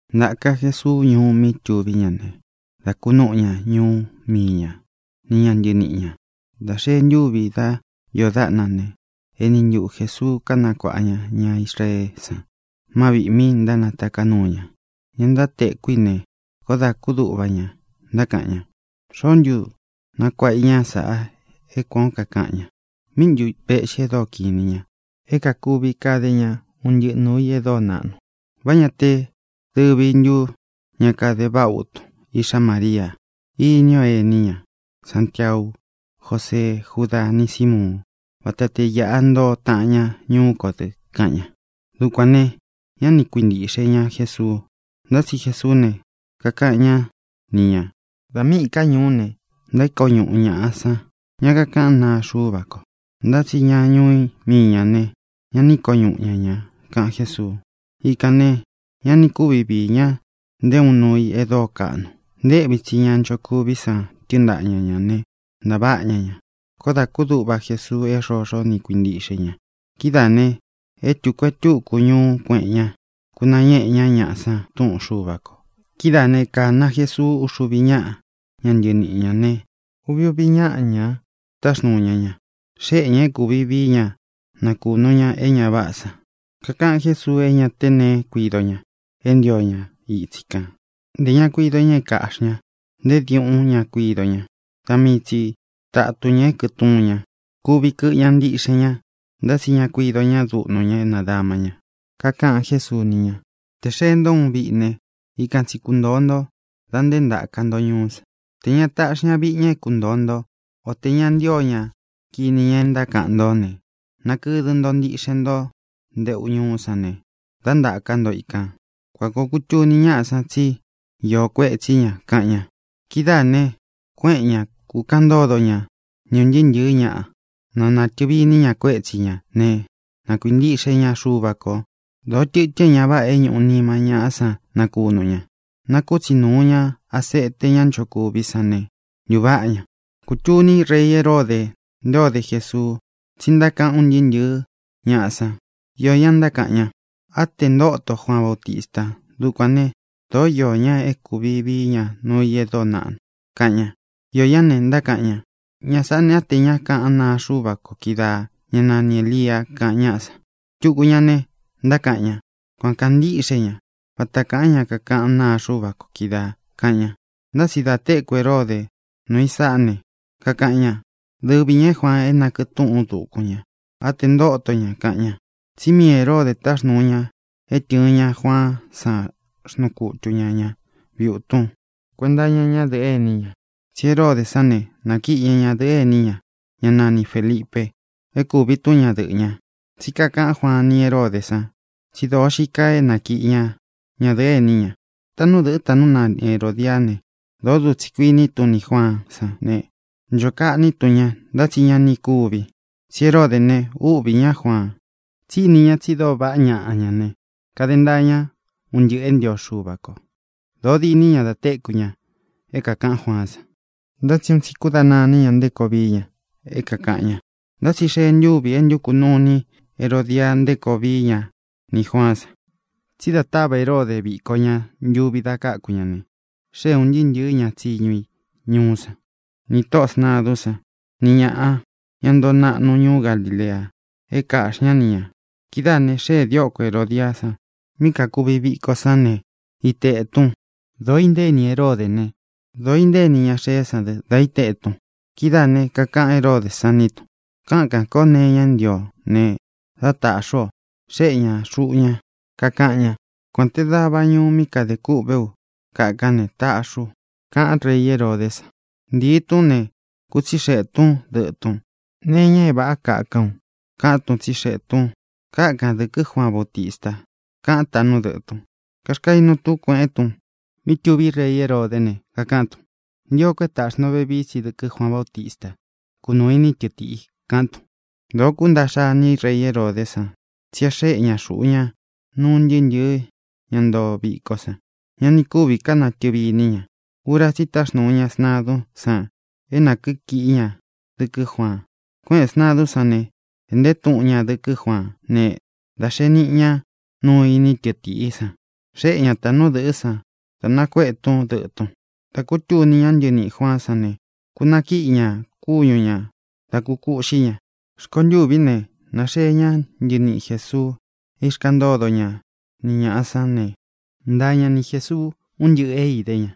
Ntāka Jesuu ñuú mí tuví ña ne, dá kūnúꞌu ña ñuú mii ña ni ña ntɨniꞌi ñā. Dā xee ntúvi dá iō dáꞌna ne, eni ntuꞌu Jēsuu kánakuāꞌa ña ña Israeé san má viꞌī mi ntánataká nuu ña. Ña ntáteku í ne, koó dā kúduꞌva ña, ntákaꞌan ña: —¿Xoó ntu nakuāꞌa i ñá saꞌa é kuān ó kakaꞌan ña? ¿Míꞌi ntu vēꞌxi e dóo kiꞌin inī ña, é kakuvi kade ña un ntɨꞌɨ nūu i e dóo naꞌnu? ¿Vá ñā te dɨvi ntu ña kade váꞌa utun, iꞌxá Maríā? Ini o ení ña, Santiau, Jósee, Júda, ni Sīmuun. Vata te īꞌa ntoo taꞌan ña ñuú kō dɨ —kaꞌan ña. Dukuān ne, ñá ni kuintīꞌxe ña Jesuu. Ntá tsi Jesuú ne, kakaꞌan ñá ni ñā: —Da míꞌī ká ñuú ne, ntaíko ñuꞌu ñāꞌa san ña kakaꞌán naa Xuva ko. Ntá tsi ña ñuú mii ñā ne, ñá ini iko ñuꞌu ña ña —kaꞌan Jésuu. Ikān ne, ña ni kúvi viī ña nté uun nuu i e dóo kaꞌnu. Nteꞌvi tsī ña nchokuví san tɨ́ɨn ntaꞌa ña ñā ne, ntaváꞌa ña ña. Koó dā kúduꞌva Jesuu é xoxo ni kuintíꞌxe i ña. Kidáā ne, e tuku e túku ñuú kueꞌen ña, kunañéꞌe ñá ñaꞌa san túꞌun Xuva kō. Kidáā né, kāna Jesuu uxuvi ñáꞌa ña ntɨniꞌi ñā ne, uvi uvi ñáꞌa ña táxnūu ña ña. Xéꞌe ñā é kūvi vií ña nakūnu ña é ña váꞌā san. Kakaꞌan Jésuu é ña te neé kuido ña é ntio ña itsi kān. Ntē ña kuido ña é kāꞌxí ña; nté diuꞌún ña kuido ña; da mii tsi tatun ñā é kɨtuun ña. Kuvi kɨꞌɨ ña ntiꞌxen ña, ntá tsi ña kuido ña dúꞌnu ña é nadama ña. Kakaꞌan Jésuu ni ña: —Tē xee ntó uun viꞌi ne, ikan tsi kuntōo nto da nté ntāka nto ñuú san. Tē ña taꞌxi ña viꞌi ña é kuntōo nto, o tē ña ntío ña kini ña é ntákaꞌan ntó ne, nakɨdɨ ntō ntiꞌxen nto nteꞌu ñuú san ne, dá ntāka ntó ikān. Kuan kōo kutuni ñáꞌa san tsi íō kuetsí ña —kaꞌan ña. Kidáā ne, kuéꞌen ña, kūkaꞌan ntódo ña ni ūn ntɨɨ́ ntɨ̄ɨ́ ñaꞌa, na nātɨvi iní ña kuétsi ñā né, na kuintiꞌxe ña Xuva kō. Dōó tɨtɨn é ña váꞌā é ñūꞌu nima ñáꞌa san nakunu ña. Nákutsi nūu ña asete ñá nchokuví san ne, ntuváꞌa ña. Kūtuní rei Heródē nté ō dé Jesuu, tsí ntákaꞌan un ntɨɨ́ ntɨ̄ɨ́ ñaꞌa san. Iō ñá ntákaꞌan ña: —Á tē e ntóto Juaan Bautista. Dukuān né, dōó iō ña é kūvi vií ña nuu i e dóo naꞌnu —kaꞌan ña. Iō ñá ne, ntákaꞌan ña: —Ña sāꞌá ne, á tē ña é kaꞌán naa Xuva ko kídaā, ñá nani Ēlia —kaꞌan ñáꞌa san. Tuku ñaꞌa ne, ntákaꞌan ña: —Kuan kāa ntíꞌxe ña, vata kaa ña kaꞌán naa Xuva ko kídaā —kaꞌan ña. Ntá tsi dā téku Heróde nūu i sáꞌa ne, kakaꞌan ña: —Dɨvi ñā é Juaan, é nakɨꞌɨ tūꞌún u dukun ña. Á tē ntóto ña —kaꞌan ña. Tsí mii Hēródē táxnūu ña é tɨ̄ɨn ña Juaán san. Xnuu kutu ña ñā viutun kuenta iña ñádɨ̄ꞌɨ ení ña, tsi Heródē sán ne, nakiꞌi ña ñadɨ̄ꞌɨ́ ení ña, ña nani Fēlipe, é kūvi tún ñadɨꞌɨ̄ ña. Tsí kakaꞌan Juaan ni Heródē san tsi dóo xii kaa é nakiꞌi ña ñadɨ̄ꞌɨ́ ení ña. Táꞌnu dɨ̄ꞌɨ́, táꞌnu nani Herōdiá ne, dōó dutsi kuíni tún nī Juaán san ne, ncho kaꞌní tun ña, ntá tsi ña ni kuvi, tsí Heródē ne, úꞌvī ñá Juaan, tsí ini ña tsi dóo vaꞌá ñaꞌa ña ne, kade ntaa ña un ntɨꞌɨ̄ é ntio Xuva ko. Dōo diní ña da téku ña é kākaꞌan Juaán san, ntá tsi un tsi kúdana iní ña nté koo vií ña é kākaꞌan ña. Ntá tsi xee ntúvi e ntúku nuu ini Herodia nté koo vií ña nī Juaán san. Tsí da táva Heródē viko ña ntuvi da káku ña ne, xée ūn ntɨɨ́ ntɨ̄ɨ́ ña tsiñu i ñuú san, nī tóꞌō sntadún san, ni ñāꞌa, ña ntoo naꞌnu ñuú Galilea, é kāꞌxi ñá ni ñā. Kidáā ne, xéē dióko Herōdiá san mí kakuvi viko sán ne, iteꞌē tun. Dōo inténi Heródē né, dōo inténi ña xeé san dɨ da íteꞌē tun. Kidáā ne, kakaꞌan Heródē sán nī tun: —Kákān kó nee iña é ntio o ne, dá tāꞌxi ú o. Xéꞌe ña xuꞌu ña, kakaꞌan ña: Kuān te dava ñuꞌu mí kadē kûꞌvé u kákan ne, taꞌxi u —kaꞌán rei Heródē san. Ntīi tún ne, kútsixeꞌē tún dɨꞌɨ̄ tun: —¿Nee iña é vāꞌá kakán u? —kaꞌan tún, tsixeꞌē tun. —Kákan dɨ̄kɨ́ Juaan Bautista —kaꞌan táꞌnu dɨꞌɨ̄ tun. Kaxkainu tún kueꞌen tun mí tuví rei Heródē ne, kakaꞌán tun: —Nchio ko é tāꞌxi nto vevií tsi dɨkɨ́ Juaan Bautista; kunūu iní tɨchiꞌi —kaꞌán tun. Dōo kúntaꞌxa iní rei Heródē san, tsí e xeꞌé ña xuꞌu ña nuu un ntɨɨ́ ntɨ̄ɨ́ ña ntoo viko san. Ña ni kúvī ká natɨ̄vi iní ña. Ura tsí i táxnūu ña sntadún san é nā kíkiꞌí ña dɨkɨ́ Juaan. Kuéꞌēn sntadún san ne, ēꞌnte túꞌun ña dɨkɨ́ Juaán ne, dā xee niꞌi ña, nuu iní tɨtiꞌí san. Xéꞌe ña tāꞌnú dɨ̄ꞌɨ́ san, da nakuéꞌe tún dɨꞌɨ̄ tun. Dā kútuní ña ntɨniꞌī Juaán san ne, kūnakíꞌi ña kúñu ñā, dá kūkuꞌxí ña. Rkontûví ne, nāxeé ña ntɨniꞌi Jēsuu é īxkaꞌan ntódo ña ni ñāꞌa sán ne, ntaa ña ni Jēsuu ún ntɨꞌɨ̄ é idé ña,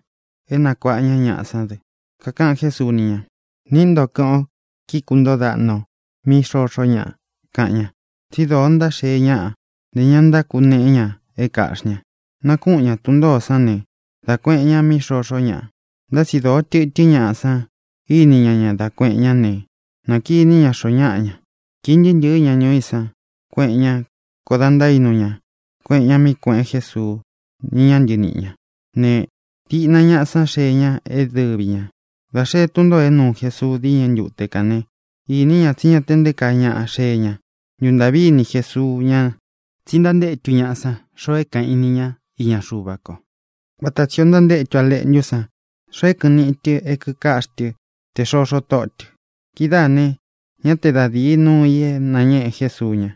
é nakuaꞌa ña ñaꞌá san dɨ. Kakaꞌan Jésuu ni ña: —Niꞌí nto, kɨ́ꞌɨn ō, kíkūntóo daꞌna ō mí xoxó ñaꞌa —kaꞌan ña. Tsi dóo ntánaxee ñáꞌa; ntē ñá ntákuneꞌé ña é kāꞌxí ña. Nakúꞌun ña tun ntōó san ne, dá kuēꞌen ña mí xoxó ñaꞌa. Ntá tsi dóo tɨtɨ́n ñaꞌa san íni ña ña dá kuēꞌen ñá ne, nakiní ña xoó ñaꞌa ña. Kīi ntɨɨ́ ntɨ̄ɨ́ ña ñuú i san, kuéꞌen ña. Koó dā ntaínu ña kueꞌen ña mí kuēꞌen Jésuu ni ña ntɨníꞌi ñā ne, diꞌna ñaꞌa sán xeé ña é dɨvi ñā. Dā xee tún ntōo é nuu Jesuu díñɨ ntute kān né, īní ña tsí ña te nté kaa ñaꞌa xee ña. Ntūntaꞌví ini Jesuu ña, tsí ntántétu ñaꞌa san xoo é kāꞌan í ni ñā iña Xuva ko, vata tsī ó ntántétu a leꞌntú san xoo é kɨꞌɨn niꞌi i tɨ é kīkaꞌxí tɨ tē xoxó tóꞌo tɨ̄. Kidáā ne, ñá te da dīi núu ī é nāñéꞌe Jesuu ña.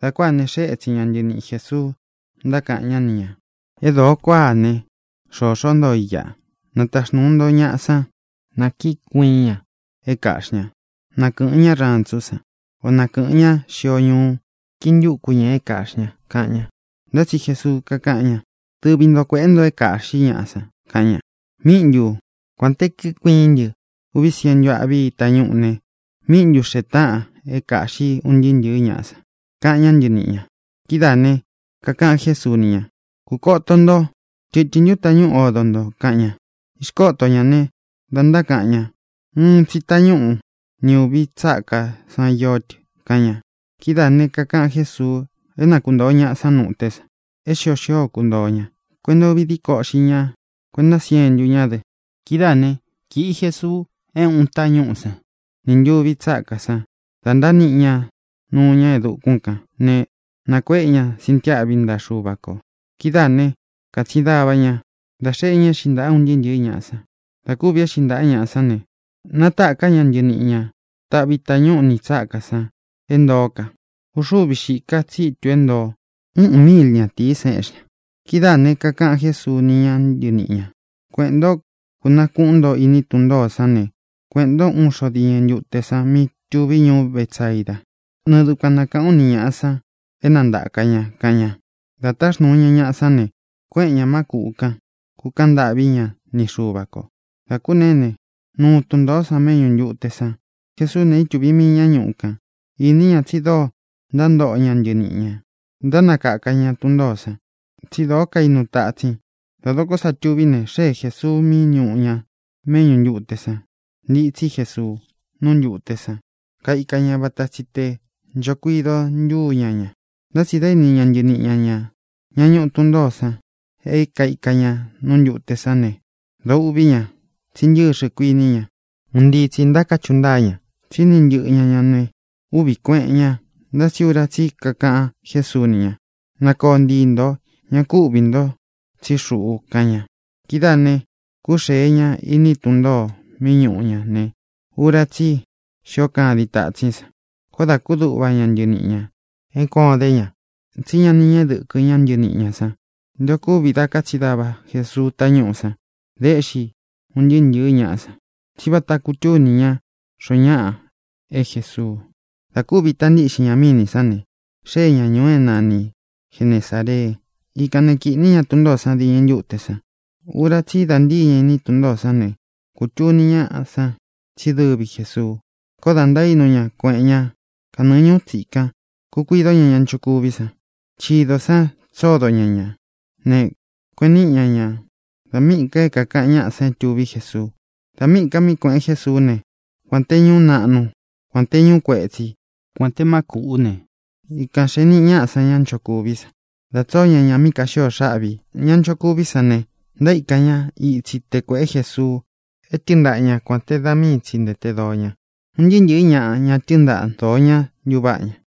Dā kuáā ne, xée etsin ña ntɨniꞌi Jēsuu, ntákaꞌan ñá ni ñā: —É dōo kuáa ne, xoxó ntoo i iꞌa. Nataxnūu nto ñaꞌa sán, nā kíkuiín ña é kāꞌxí ña. Na kɨ̄ꞌɨn ñá rantsú san, o na kɨ̄ꞌɨn ñá xio ñuu, kintúku ñā é kāꞌxí ña —kaꞌan ña. Ntá tsi Jesuu kakáꞌan ña: —Dɨvi nto kuēꞌé nto é kāꞌxí ñaꞌa san —kaꞌan ña. —¿Míꞌi ntū? Kuān te kíkuiín ntɨ uvi sientu aꞌví tañúꞌū ne, ¿míꞌi ntu xēe táꞌan é kāꞌxí un ntɨɨ́ ntɨ̄ɨ́ ñaꞌa san? —kaꞌan ñá ntɨniꞌi ñā. Kidáā né, kakaꞌan Jésuu ni ña: —Kūkoto nto: ¿tɨtɨ̄n ntú tañúꞌu odo nto? —kaꞌan ña. Īxkóto ñā ne, da ntákaꞌan ña: —Úꞌun tsī tañúꞌu ni ūvi tsákā san ió tɨ —kaꞌan ña. Kidáā ne, kakaꞌan Jésuu é na kuntōo ñaꞌa san nú ité san é xio xío kuntōo ña: kuenta úvi díko uꞌxi ña, kuenta siéntu ñá dɨ. Kidáā né, kīꞌi Jesuu é ūꞌun tañúꞌū sán nī ntuvi tsákā san. Da ntániꞌi ña nuu ña e dukún kān ne, nakuéꞌe ña sintiáꞌvi ntaꞌa Xuva kō. Kidáā né, kātsin dava ña, dā xeꞌé ña éꞌxi ntaꞌa un ntɨɨ́ ntɨ̄ɨ́ ñaꞌa san. Dā kúvī éꞌxi ñaꞌa sán ne, natáka ña ntɨniꞌi ña taꞌvī tañúꞌu nī tsákā san é ntoó ka. Uxúvi xīká ka tsítū é ntoo. Uꞌun míil ñatīí san éꞌxi ña. Kidáā ne, kakaꞌan Jésuu ni ña ntɨníꞌi ñā: —Kueꞌēn ntó, kūnakuꞌún nto iní tun ntōó san ne, kueꞌēn ntó uun xo diñɨ ntute san mí tuví ñuú Betsaida. Nɨɨ dukuan na kāꞌán u ni ñāꞌa san é na ntāka ña —kaꞌan ña. Dā nátaxnūu ña ñaꞌa sán ne, kuéꞌen ñā má kūꞌu kán, kūkaꞌan ntâꞌví ña ni Xuva kō. Dā kúneé ne, nuu tun ntōó san méꞌñū ntute san. Jesuú ne, ítuvī mii ñá ñuꞌu kan. Īní ña tsi dóo ntántoꞌo ña ntɨniꞌi ñā, ntánakaka ña tun ntōó san, tsi dóo kainu tatsin. Dā dokó sa tuví ne, xée Jēsuu mí ñūꞌu ña méꞌñū ntute san. Ntitsí Jesuu nú ntūte san, kaíka ña, vata tsi tē ncho kuido ntúu ña ña, ntá tsi dā íni ña ntɨniꞌi ña ñā, ñá ñuꞌu tun ntōó san, é kaika ña nú ntūte sán ne, dōo uꞌví ña, tsí ntɨxɨ, kuiní ña. Un ntii tsī ntáchuꞌu ntáa ña, tsi íni ntɨꞌɨ ña ña ne, úꞌvī kueꞌen ña. Ntá tsi ura tsí i kakaꞌan Jésuu ni ña: —¡Na kōo ntii nto! Ñá ku uꞌvī nto, tsí xuꞌu —kaꞌan ña. Kidáā ne, kúxēe ña iní tun ntōo mí ñūꞌu ña ne, ura tsí i xío kadin tatsín san. Koó dā kúduꞌva ña ntɨniꞌi ñā é kuān o idé ña. Tsí ña ní ñeꞌe dɨkɨ ñá ntɨniꞌi ñā san nté ō kúvi da kátsin dava Jesuu tañúꞌū san da éꞌxi un ntɨɨ́ ntɨ̄ɨ́ ñaꞌa san. Tsí vata kutúni ña xoó ñaꞌa é Jēsuu. Dā kúvi ita ntíꞌxin ña mínī sán ne, xée ña ñūu é nani Genesāree. Ikān né, kīꞌní ña tun ntōó san diñɨ ntute san. Ura tsí i da ntíi ña iní tun ntōó san ne, kūtuni ñáꞌa san tsí dɨvi Jēsuu. Koó dā ntaínu ña, kueꞌen ña kanɨɨ ñūú tsikan, kūkuidó ña ña nchokuví san. Chidō san tsódo ña ñā ne, kueꞌen níꞌi ña ña dā míꞌī ka é kākaꞌan ñáꞌā é tuví Jesuu. Dā míꞌī ka mí kuēꞌen Jésuú ne, kuān te ñuú naꞌnu, kuān te ñuú kuetsi, kuān te má kūꞌú ne, ikān xee niꞌi ñaꞌá san ñá nchokuví san, dā tsóo ña ña mí kāxíō xáꞌvī. Ña ntánchokuví san ne, ntaíkan ña itsi te kuēꞌé Jesuu é tɨɨn ntaꞌa ña kuān te da míi tsi ntēte doo ña. Un ntɨɨ́ ntɨ̄ɨ́ ñaꞌa, ña tɨ́ɨn ntaꞌa dōo ñá, ntūváꞌa ña.